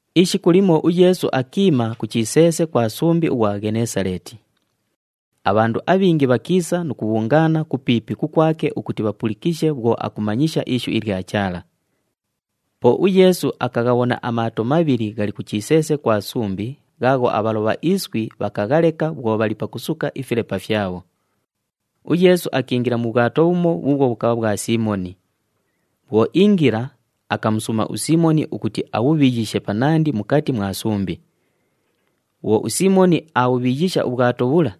Ishiku limo uYeesu akiima ku chiseese kwa sumbi ughwa Ghenesaleeti. Abhandu abhingi bhakiisa nu kubhungaana kupiipi kukwake ukuti bhapulikishe bhwo akumanyisha ishu ilya Chaala. Po uYeesu akaghabhona amaato mabhili ghali ku chiseese kwa sumbi ghaagho abhalobha iswi bhakaghaleka bhwo bhali pakusuka ifilepa fyabho. UYeesu akiingila mu bhwato bhumo bhuubhwo bhukabha bhwa Siimoni. Bhwo iingila, akamusuuma uSiimoni ukuti abhubhiyishe panandi mukati mwa sumbi. Bhwo uSiimoni aabhubhiyisha ubhwato bhula,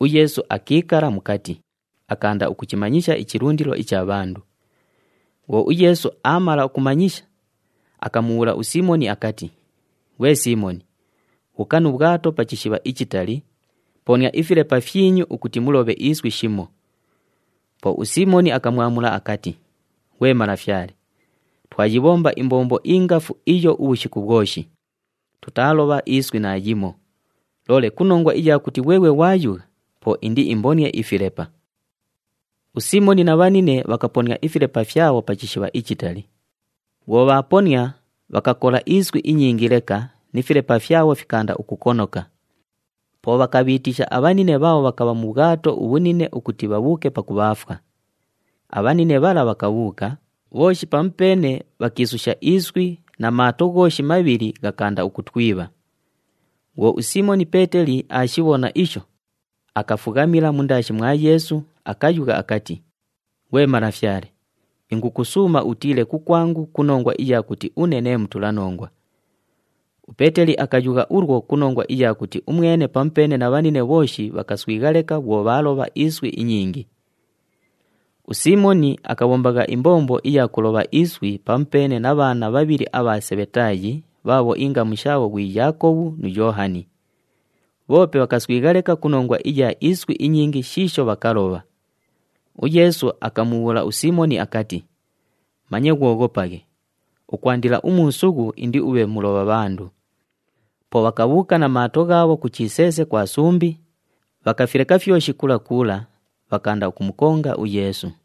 uYeesu akiikala mukati, akaanda akuchimanyisha ichilundilo icha bhandu. Bhwo uYeesu aamala ukumanyisha, akamubhuula uSiimoni akati, “Ghwe Siimoni, bhuuka nu bhwato pa chishibha ichitali, ponia ifilepa fyinyu ukuti mulobhe iswi shimo.” Po uSiimoni akamwamula akati, “Ghwe Malafyale, twayibhomba imbombo ingafu iyo ubhushiku bhwoshi, tutaalobha iswi naayimo, loole ku nongwa iya kuti ghweghwe ghwayugha, po indiimbonie ifilepa.” USiimoni na bhanine bhakaponia ifilepa fyabho pa chishibha ichitali. Bhwo bhaaponia, bhakakola iswi inyingi leka ni filepa fyabho fikaanda ukukonoka. Po bhakabhiitisha abhanine bhaabho bhakabha mu bhwato ubhunine ukuti bhabhuuke pakubhaafwa. Abhanine bhala bhakabhuuka, bhooshi pamupeene bhakiisusha iswi na maato ghooshi mabhili ghakaanda ukutwibha. Bhwo uSiimoni Peeteli aashibhona isho, akafughamila mundaashi mwa Yeesu, akayugha akati, “Ghwe Malafyale, ingukusuuma utiile kukwangu ku nongwa iya kuti une nee mutulanongwa.” UPeeteli akayugha ulwo ku nongwa iya kuti umwene pamupeene na bhanine bhooshi bhakaswigha leka bhwo bhaalobha iswi inyingi. USiimoni akabhombagha imbombo iya kulobha iswi pamupeene na bhaana bhabhili abha Sebhetaayi bhaabho ingamu shaabho ghwi Yaakobhu nu Yoohani. Bhoope bhakaswigha leka ku nongwa iya iswi inyingi shiisho bhakalobha. UYeesu akamubhuula uSiimoni akati, “Manye ghwoghopaghe, ukwandila umuusughu indiubhe mulobha bhandu.” Po bhakabhuuka na maato ghaabho ku chiseese kwa sumbi, bhakafileka fyoshi kula kula, bhakaanda ukumukonga uYeesu.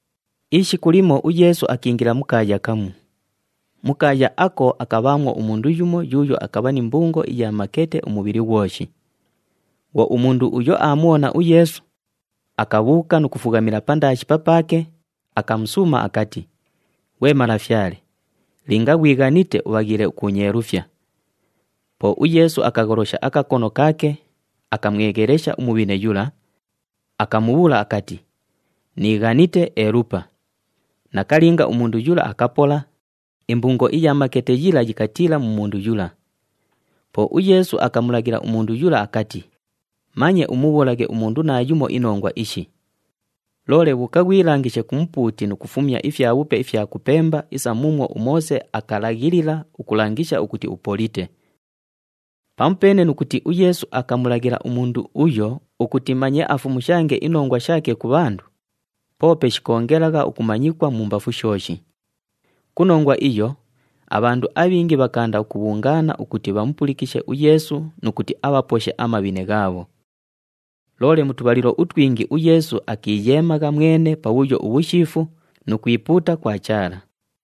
Ishiku limo uYeesu akiingila mu kaaya kamu. Mu kaaya ako akabhaamwo umundu yumo yuuyo akabha ni mbungo iya makete umubhili ghwoshi. Bhwo umundu uyo aamubhona uYeesu, akabhuuka nu kufughamila pandaashi papaake, akamusuuma akati, “Ghwe Malafyale, linga ghwighanite ubhaghiile ukuunyeelufya.” Po uYeesu akagholosha akakono kaake, akamweghelesha umubhine yula, akamubhuula akati, “Niighanite, elupa!” Nakalinga, umundu yula akapola, imbungo iya makete yila yikatiila mu mundu yula. Po uYeesu akamulaghila umundu yula akati, “Manye umubhuulaghe umundu naayumo inongwa ishi. Loole bhuuka ghwilangishe ku mupuuti nu kufumya ifyabhupe ifya kupemba isa muumwo uMoose akalaghilila ukulangisha ukuti upolite.” Pamupeene nu kuti uYeesu akamulaghila umundu uyo ukuti manye afumushange inongwa shaake ku bhandu, poope shikoongelagha ukumanyikwa mumbafu shooshi. Ku nongwa iyo, abhandu abhingi bhakaanda ukubhungaana ukuti bhamupulikishe uYeesu nu kuti abhaposhe amabhine ghaabho. Loole mu tubhalilo utwingi uYeesu akiiyeemagha mwene pabhuyo ubhushiifu nu kwipuuta kwa Chaala.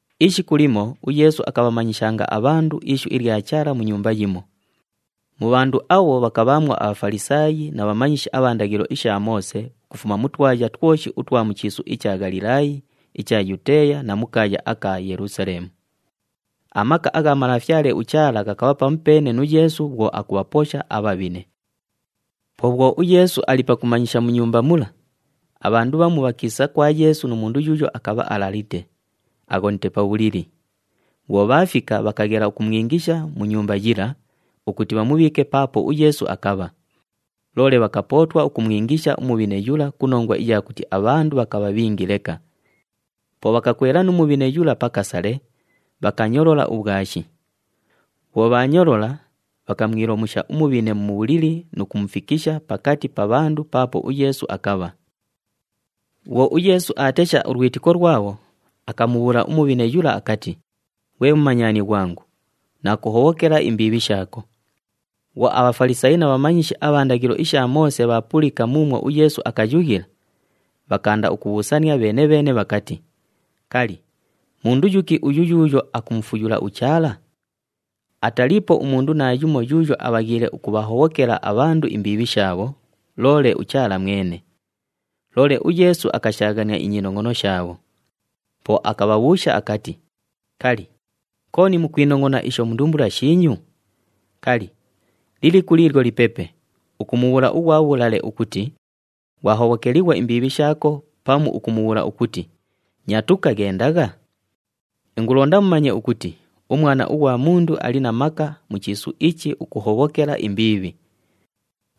Ishiku limo uYeesu akabhamanyishanga abhandu ishu ilya Chaala mu nyumba yimo. Mu bhandu abho bhakabhaamwo aBhafalisaayi na bhamanyishi abha ndaghilo isha Moose ukufuma mu twaya twoshi utwa mu chiisu icha Ghalilaayi, icha Yuteeya na mu kaaya aka Yelusaleemu. Amaka agha Malafyale uChaala ghakabha pamupeene nu Yeesu bhwo akubhaposha abhabhine. Po bhwo uYeesu ali pakumanyisha mu nyumba mula, abhandu bhamu bhakiisa kwa Yeesu nu mundu yuuyo akabha alalite, aghonite pa bhulili. Bhwo bhaafika, bhakaghela ukumwingisha mu nyumba yila ukuti bhamubhiike paapo uYeesu akabha. Loole bhakapootwa ukumwingisha umubhine yula ku nongwa iya kuti abhandu bhakabha bhingi leka. Po bhakakwela nu mubhine yula pa kasale, bhakanyolola ubhwashi. Bhwo bhaanyolola, bhakamwilomusha umubhine mu bhulili nu kumufikisha pakati pa bhandu paapo uYeesu akabha. Bhwo uYeesu aatesha ulwitiko lwabho, akamubhuula umubhine yula akati, “Ghwe mumanyani ghwangu, naakuhobhokela imbiibhi shaako.” Bhwo aBhafalisaayi na bhamanyishi abha ndaghilo isha Moose bhaapulika muumwo uYeesu akayughila, bhakaanda ukubhuusania bheene-bheene bhakati, “Kali, mundu yuki uyu yuuyo akumufuyula uChaala? Ataliipo umundu naayumo yuuyo abhaghiile ukubhahobhokela abhandu imbiibhi shaabho, loole uChaala mwene.” Loole uYeesu akashaaghania inyinongʼono shaabho. Po akabhabhuusha akati, “Kali, kooni mukwinongʼona isho mu ndumbula shiinyu? Kali, liliku liilyo lipepe, ukumubhuula ughwa bhulale ukuti, ‘Ghwahobhokelighwa imbiibhi shaako,’ pamu ukumubhuula ukuti, ‘Nyatuka, ghendagha’? Ingulonda mumanye ukuti uMwana ughwa Mundu ali na maka mu chiisu ichi ukuhobhokela imbiibhi.”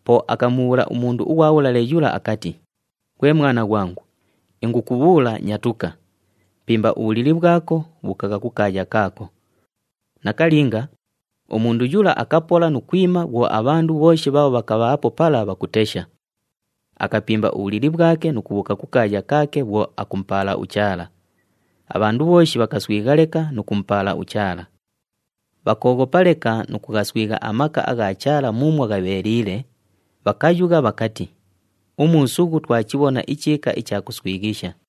Po akamubhuula umundu ughwa bhulale yula akati, “Ghwe mwana ghwangu, ingukubhuula, nyatuka, pimba ubhulili bhwako, bhuukagha kukaaya kaako.” Nakalinga, umundu yula akapola nu kwima bhwo abhandu bhooshi bhaabho bhakabhaapo pala bhakutesha, akapimba ubhulili bhwake nu kubhuuka kukaaya kaake bhwo akumupaala uChaala. Abhandu bhooshi bhakaswigha leka nu kumupaala uChaala. Bhakooghopa leka nu kughaswigha amaka agha Chaala muumwo ghabheeliile, bhakayugha bhakati, “Umuusughu twachibhona ichiika icha kuswighisha!”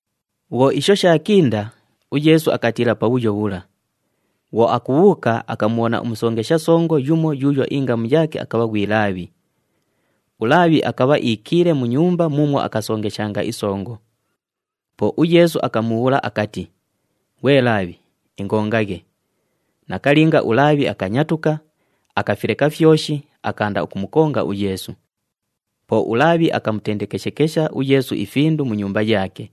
Bhwo isho shaakinda, uYeesu akatiila pabhuyo bhula. Bhwo akubhuuka, akamubhona umusongesha songo yumo yuuyo ingamu yaake akabha ghwi Laabhi. ULaabhi akabha iikiile mu nyumba muumwo akasongeshanga isongo. Po uYeesu akamubhuula akati, “Ghwe Laabhi, ingongaghe.” Nakalinga, uLaabhi akanyatuka, akafileka fyoshi, akaanda ukumukonga uYeesu. Po uLaabhi akamutendekeshekesha uYeesu ifindu mu nyumba yaake.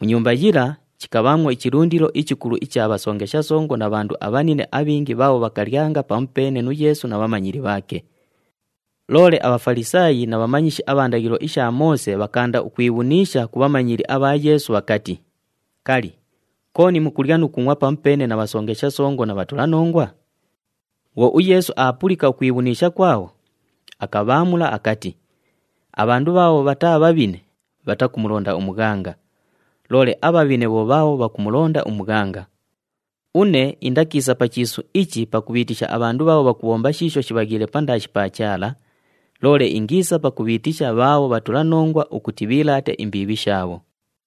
Mu nyumba yila, chikabhaamwo ichilundilo ichikulu icha bhasongesha songo na bhandu abhanine abhingi bhaabho bhakalyanga pamupeene nu Yeesu na bhamanyili bhaake. Loole aBhafalisaayi na bhamanyishi abha ndaghilo isha Moose bhakaanda ukwibhuniisha ku bhamanyili abha Yeesu bhakati, “Kali, kooni mukulya nu kungʼwa pamupeene na bhasongesha songo na bhatulanongwa?” Bhwo uYeesu aapulika ukwibhuniisha kwabho, akabhaamula akati, “Abhandu bhaabho bhataa bhabhine, bhatakumulonda umughanga, loole abhabhine bho bhaabho bhakumulonda umughanga. Une indakiisa pa chiisu ichi pakubhiitisha abhandu bhaabho bhakubhomba shiisho shibhaghiile pandaashi pa Chaala, loole ingiisa pakubhiitisha bhaabho bhatulanongwa ukuti bhiilaate imbiibhi shaabho.”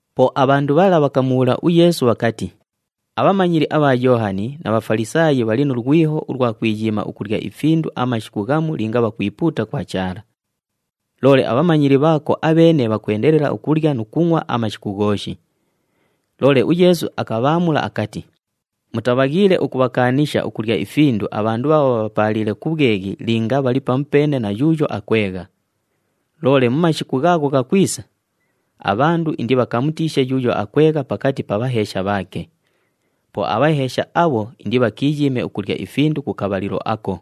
Po abhandu bhala bhakamubhuula uYeesu bhakati, “Abhamanyili abha Yoohani na bha Bhafalisaayi bhali nu lwiho ulwa kwiyiima ukulya ifindu amashiku ghamu linga bhakwipuuta kwa Chaala. Loole abhamanyili bhaako abheene bhakwendelela ukulya nu kungʼwa amashiku ghooshi!” Loole uYeesu akabhaamula akati, “Mutabhaghiile ukubhakaanisha ukulya ifindu abhandu bhaabho bhabhapaaliile ku bhweghi linga bhali pamupeene na yuuyo akwegha. Loole mu mashiku ghaagho ghakwisa, abhandu indibhakamutiishe yuuyo akwegha pakati pa bhaheesha bhaake. Po abhaheesha abho indibhakiiyiime ukulya ifindu ku kabhalilo ako.”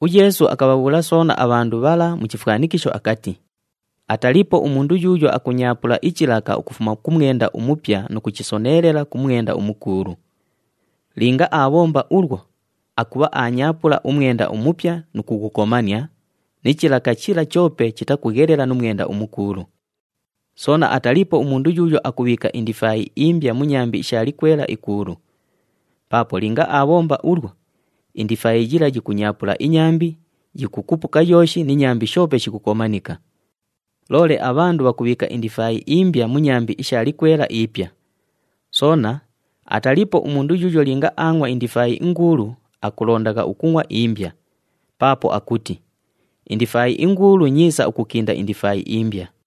UYeesu akabhabhuula soona abhandu bhala mu chifwanikisho akati, “Ataliipo umundu yuuyo akunyaapula ichilaka ukufuma ku mwenda umupya nu kuchisoneelela ku mwenda umukuulu. Linga aabhomba ulwo, akubha aanyaapula umwenda umupya nu kughukomania, ni chilaka chila choope chitakughelela nu mwenda umukuulu. Soona ataliipo umundu yuuyo akubhiika indifaayi imbya mu nyambi isha likwela ikuulu. Paapo linga aabhomba ulwo, indifaayi yila yikunyaapula inyambi, yikukupuka yooshi ni nyambi shoope shikukomanika. Loole abhandu bhakubhiika indifaayi imbya mu nyambi isha likwela ipya. Soona ataliipo umundu yuuyo linga aangʼwa indifaayi inguulu akulondagha ukungʼwa imbya, paapo akuti, ‘Indifaayi inguulu nyiisa ukukinda indifaayi imbya.’”